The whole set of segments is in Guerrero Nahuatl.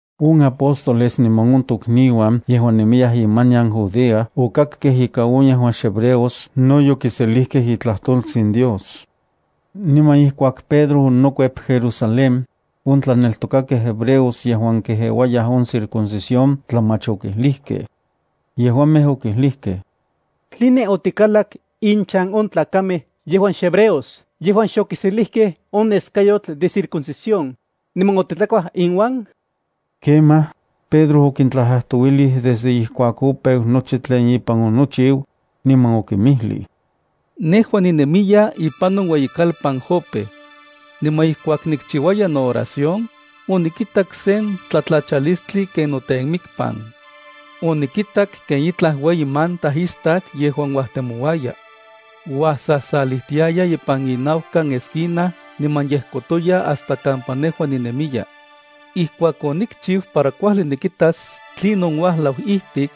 On apóstoles niman on tokniuan yejuan nemiyaj imanian Judea okakkej ika on yejuan xhebreos no yokiselijkej itlajtoltsin Dios. Niman ijkuak Pedro onokuep Jerusalén, on tlaneltokakej hebreos yejuan kejeuayaj on circuncisión tlamach okijlijkej. Yejuamej okijlijkej: —¿Tline otikalak inchan on tlakamej yejuan xhebreos yejuan xokiselijkej on neskayotl de circuncisión, niman otitlakuaj inuan? Kemaj, Pedro okintlajtlajtouilij desde ijkuak opeu nochi tlen ipan onochiu, niman okinmijlij: —Nejua ninemiya ipan on ueyikalpan Jope. Niman ijkuak nikchiuaya nooración, onikitak sen tlatlachalistli ken notemikpan. Onikitak ken itlaj ueyi manta istak yejuan uajtemouaya. Uajsasalijtiaya ipan inaukan esquina niman yejkotoya hasta kampa nejua ninemiya. Ijkuak onikchiu para kuajli nikitas tlinon uajlau ijtik,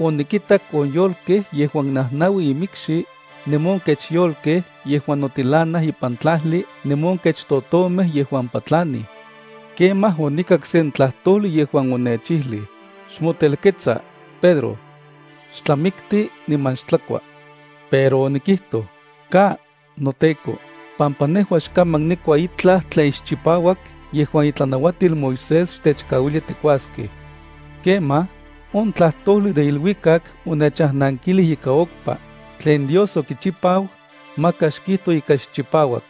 onikitak on yolkej yejuan najnaui imikxi, niman on kech yolkej yejuan notilanaj ipan tlajli niman on kech totomej yejuan patlanij. Kemaj onikak sen tlajtojli yejuan onechijlij: “Xmotelketsa, Pedro. Xtlamikti niman xtlakua.” Pero onikijtoj: “Ka, noTEKO, pampa nejua xkaman nikua itlaj tlen xchipauak yejuan itlanauatil Moisés xtechkauilia tikuaskej.” Kemaj, on tlajtojli de iluikak onechajnankilij ika okpa: “Tlen Dios okichipau, maka xkijto ika xchipauak.”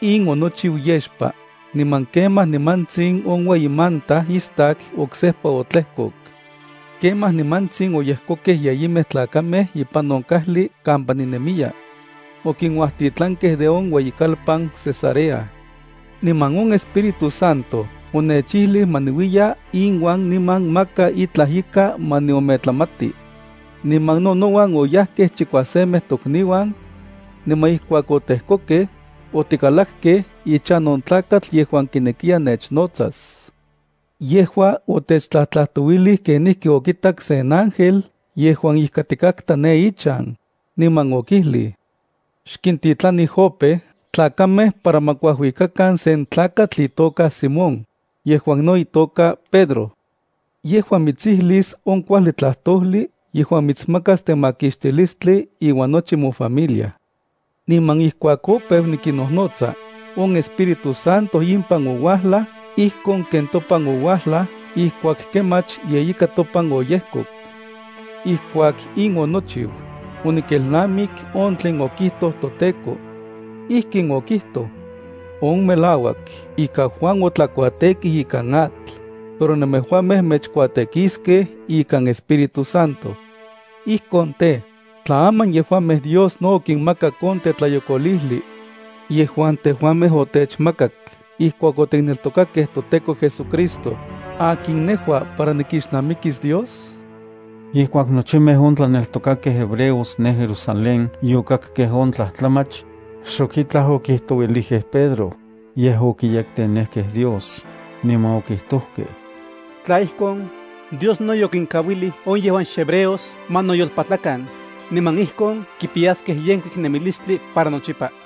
In onochiu yexpa, niman kemaj nimantsin on ueyi manta istak oksejpa otlejkok. Kemaj nimantsin oyejkokej yeyimej tlakamej ipan on kajli kampa ninemiya. Okinuajtitlankej de on ueyikalpan Cesarea. Niman on Espíritu Santo onechijlij ma niuiya inuan niman maka itlaj ika ma niometlamati. Niman no nouan oyajkej chikuasemej tokniuan. Niman ijkuak otejkokej, otikalakkej ichan on tlakatl yejuan kinekiya nechnotsas. Yejua otechtlajtlajtouilij kenijki okitak sen ángel yejuan ijkatikatka ne ichan, niman okijlij: “Xkintitlani Jope tlakamej para ma kuajuikakan sen tlakatl itoka Simón, yejuan no itoka Pedro. Yejua mitsijlis on kuajli tlajtojli yejuan mitsmakas temakixtilistli iuan nochi mofamilia.” Niman ijkuak opeu nikinnojnotsa, on Espíritu Santo impan ouajlaj ijkon ken topan ouajlaj ijkuak kemach yeika topan oyejkok. Ijkuak in onochiu, onikelnamik on tlen okijtoj toTEKO. Ijkin okijtoj: “On melauak ika Juan otlakuatekij ikan atl, pero nemejuamej mechkuatekiskej ikan Espíritu Santo.” Ijkon tej, tla aman yejuamej Dios no okinmakak on tetlayokolijli yejuan tejuamej otechmakak ijkuak otikneltokakej toTEKO JesuCristo, ¿akin nejua para nikixnamikis Dios? Ijkuak nochimej on tlaneltokakej hebreos ne Jerusalén yokakkej on tlajtlamach, xok itlaj okijtouilijkej Pedro, yej okiyektenejkej Dios, niman okijtojkej: —Tla ijkon, Dios no yokinkauilij on yejuan xhebreos ma noyolpatlakan, niman ijkon kipiyaskej yenkuik nemilistli para nochipa.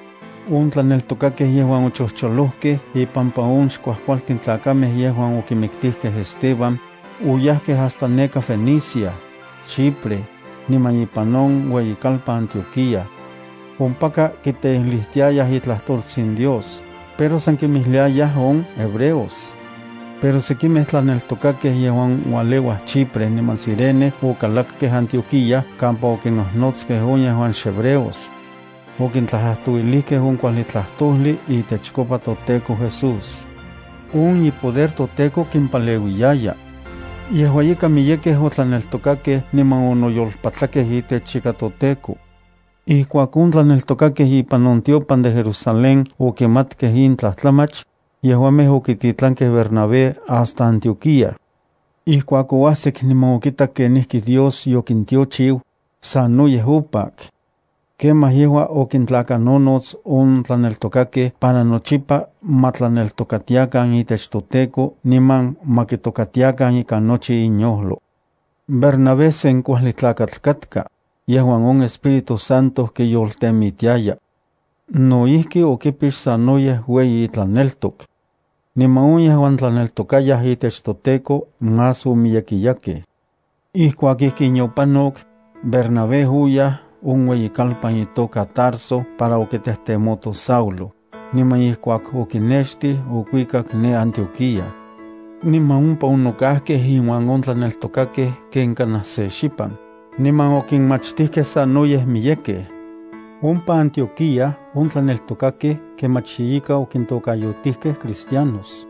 On tlaneltokakej yejuan ochojcholojkej ipampa on xkuajkualtin tlakamej yejuan okimiktijkej Esteban, oyajkej hasta neka Fenicia, Chipre, niman ipan on ueyikalpan Antioquía. Ompaka, kiteijlijtiayaj itlajtoltsin Dios, pero san kinmijliayaj on hebreos. Pero sekimej tlaneltokakej yejuan ualeuaj Chipre niman Cirene okalakej Antioquía kampa okinnojnotskej on yejuan xhebreos. Okintlajtlajtouilijkej on kuajli tlajtojli itechkopa toTEKO Jesús. On ipoder toTEKO kimpaleuiyaya. Yejua ika miyekej otlaneltokakej niman onoyolpatlakej itech ika toTEKO. Ijkuak on tlaneltokakej ipan on tiopan de Jerusalén okimatkej in tlajtlamach, yejuamej okititlankej Bernabé hasta Antioquía. Ijkuak oajsik niman okitak kenijki Dios yokintiochiu, sanoyej opak. Kemaj yejua okintlakanonots on tlaneltokakej para nochipa ma tlaneltokatiakan itech toTEKO niman ma kitokatiakan ikan nochi inyojlo. Bernabé sen kuajli tlakatl katka, yejuan on Espíritu Santo kiyoltemitiaya. No ijki okipix sanoyej ueyi itlaneltok. Niman on yejuan tlaneltokayaj itech toTEKO más omiyekiyakej. Ijkuak ijkin yopanok, Bernabé oyaj on ueyi kalpan itoka Tarso para okitejtemoto Saulo, niman ijkuak okinextij, okuikak ne Antioquía. Niman ompa onokajkej inuan on tlaneltokakej ken kanaj se xipan, niman okinmachtijkej sanoyej miyekej. Ompa Antioquía on tlaneltokakej kemach ye ika okintokayotijkej cristianos.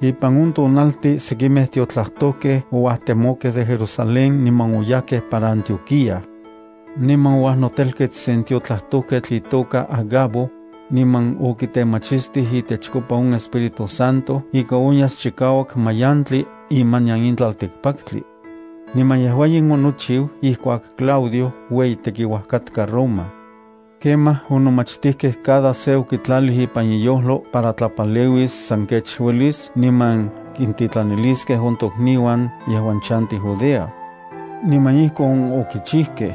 Ipan on tonaltin sekimej tiotlajtojkej ouajtemokej de Jerusalén niman oyajkej para Antioquía. Niman ouajnotelkets sen tiotlajtojketl itoka Agabo, niman okitemachistij itechkopa on Espíritu Santo ika onyas chikauak mayantli imanian in tlaltikpaktli. Niman yejua in onochiu ijkuak Claudio ueyi tekiuaj katka Roma. Kemaj, on nomachtijkej cada se okitlalij ipan iyojlo para tlapaleuis san kech uelis niman kintitlaniliskej on tokniuan yejuan chantij Judea. Niman ijkon okichijkej.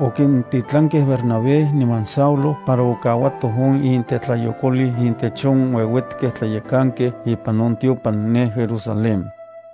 Okintitlankej Bernabé niman Saulo para okauatoj on intetlayokolil intech on ueuetkej tlayekankej ipan on tiopan ne Jerusalén.